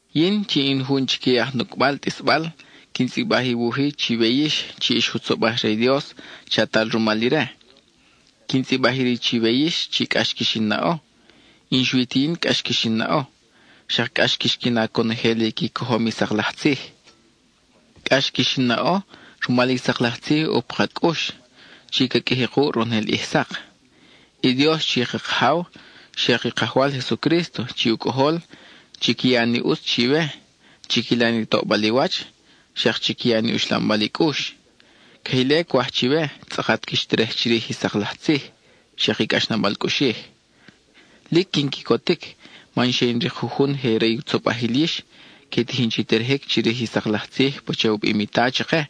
Yin, chi in jun chique i aj nucʼbal tʼisbal quin tzʼibaj i wuj-i chiwe yix chi ix jutzobaj re i Dios, chatal rumal ire. Quin tzʼibaj iri chiwe yix chi cʼax quix in naʼo, y n-xui ti yin cʼax quix in naʼo, xak cʼax quix qui na conojel i qui cojom i sak laj tzij. Cʼax quix in naʼo rumal i sak laj tzij ʼo pa ka cʼux, chi ca qʼuiji kuʼ ronojel ʼij sak. I Dios chi ka Kajaw, xak i Kajwal Jesucrísto chi u Cʼojol, chiqui ya ni ʼutz chiwe, chiquila ni toʼbal i wach, xak chiqui ya ni uxlambal i cʼux. Queje ile cwaj chiwe tzʼakat quix terej chirij i sak laj tzij, xak i cʼaxnabal cʼuxij. Lic quin quicotic man xe in rik jujun je re i tzobajil yix que tijin chi terejic chirij i sak laj tzij pacha u bim i Ta chake.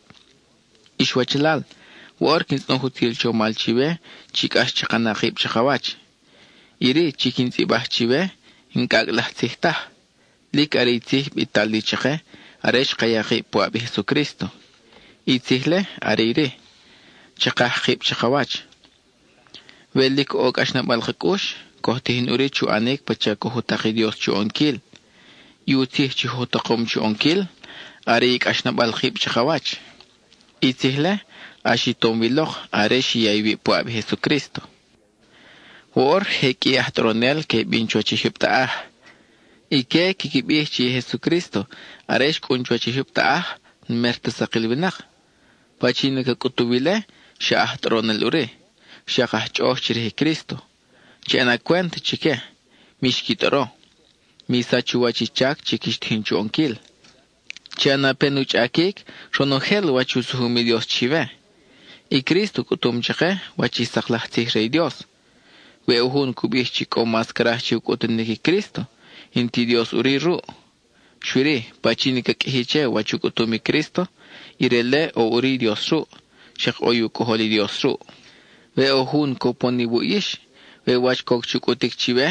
Ix wachalal, woʼor quin tzʼonoj utzil chomal chiwe chi cʼax chaka na kib chakawach. Iri chi quin tzʼibaj chiwe n-cʼacʼ laj tzij taj, lic are i tzij bital li chake are xka ya kib puʼab i Jesucrísto. (I tzij-le are iri: chakaj kib chakawach.) We lic ʼo cʼaxnabal ka cʼux, coj tijin ʼuri chu ʼanic pacha coj u tak i Dios chu ʼonquil. I u tzij chi oj u takom chu ʼonquil are i cʼaxnabal kib chakawach; i tzij-le ʼax i tom wi lok are xi ya iwib puʼab i Jesucrísto. Woʼor je qʼui i aj tʼoronel que bin chuwach i jyub taʼaj. Ique quiqui bij chi Jesucrísto, are xcʼun chuwach i jyub taʼaj, n-mer ta sakil winak. Pachin i ca cʼutuw ile, xa aj tʼoronel ʼuri, xak aj chʼoʼoj chirij i Crísto. Chi ʼana cwent chique, mix qui tʼoro; mi sach u wach i chac chi quix tijin chu ʼonquil. Chi ʼana pen u chʼaquic ronojel wach i u sujum i Dios chiwe. I Crísto u cʼutum chake wach i sak laj tzij re i Dios; we ʼo jun cu bij chi cʼo mas craj che u cʼutunic i Crísto, n-ti Dios ʼuri ruʼ. Xui-ri, pachin i ca qʼuiji che wach u cʼutum i Crísto, ire-le ʼo ʼuri i Dios ruʼ, xak ʼo i u Cʼojol i Dios ruʼ. We ʼo jun cupon iwuʼ yix, we wach coc chu cʼutic chiwe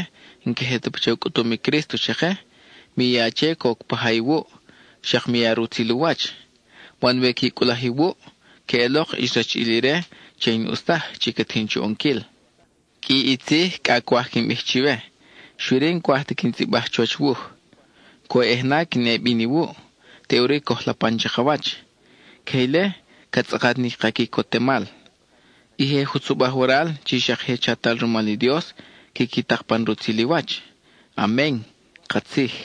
n-queje ta pacha u cʼutum i Crísto chake, mi ya che coc pa ja iwuʼ, xak mi ya rutzil u wach. Man we qui cʼulaj iwuʼ, queʼelok ix rachiʼil ire che i n-ʼus taj chi ca tijin chu ʼonquil. Qʼui i tzij cʼa cwaj quin bij chiwe, xui-ri n-cwaj ta quin tzʼibaj chuwach wuj. Cwoyʼej na quin ʼe bin iwuʼ, teʼuri coj lapan chakawach; queje ile ca tzʼakat ni ka quicotemal. I je jutzobaj waral chi xak je chatal rumal i Dios, quiqui tak pan rutzil i wach. Amen (katzij).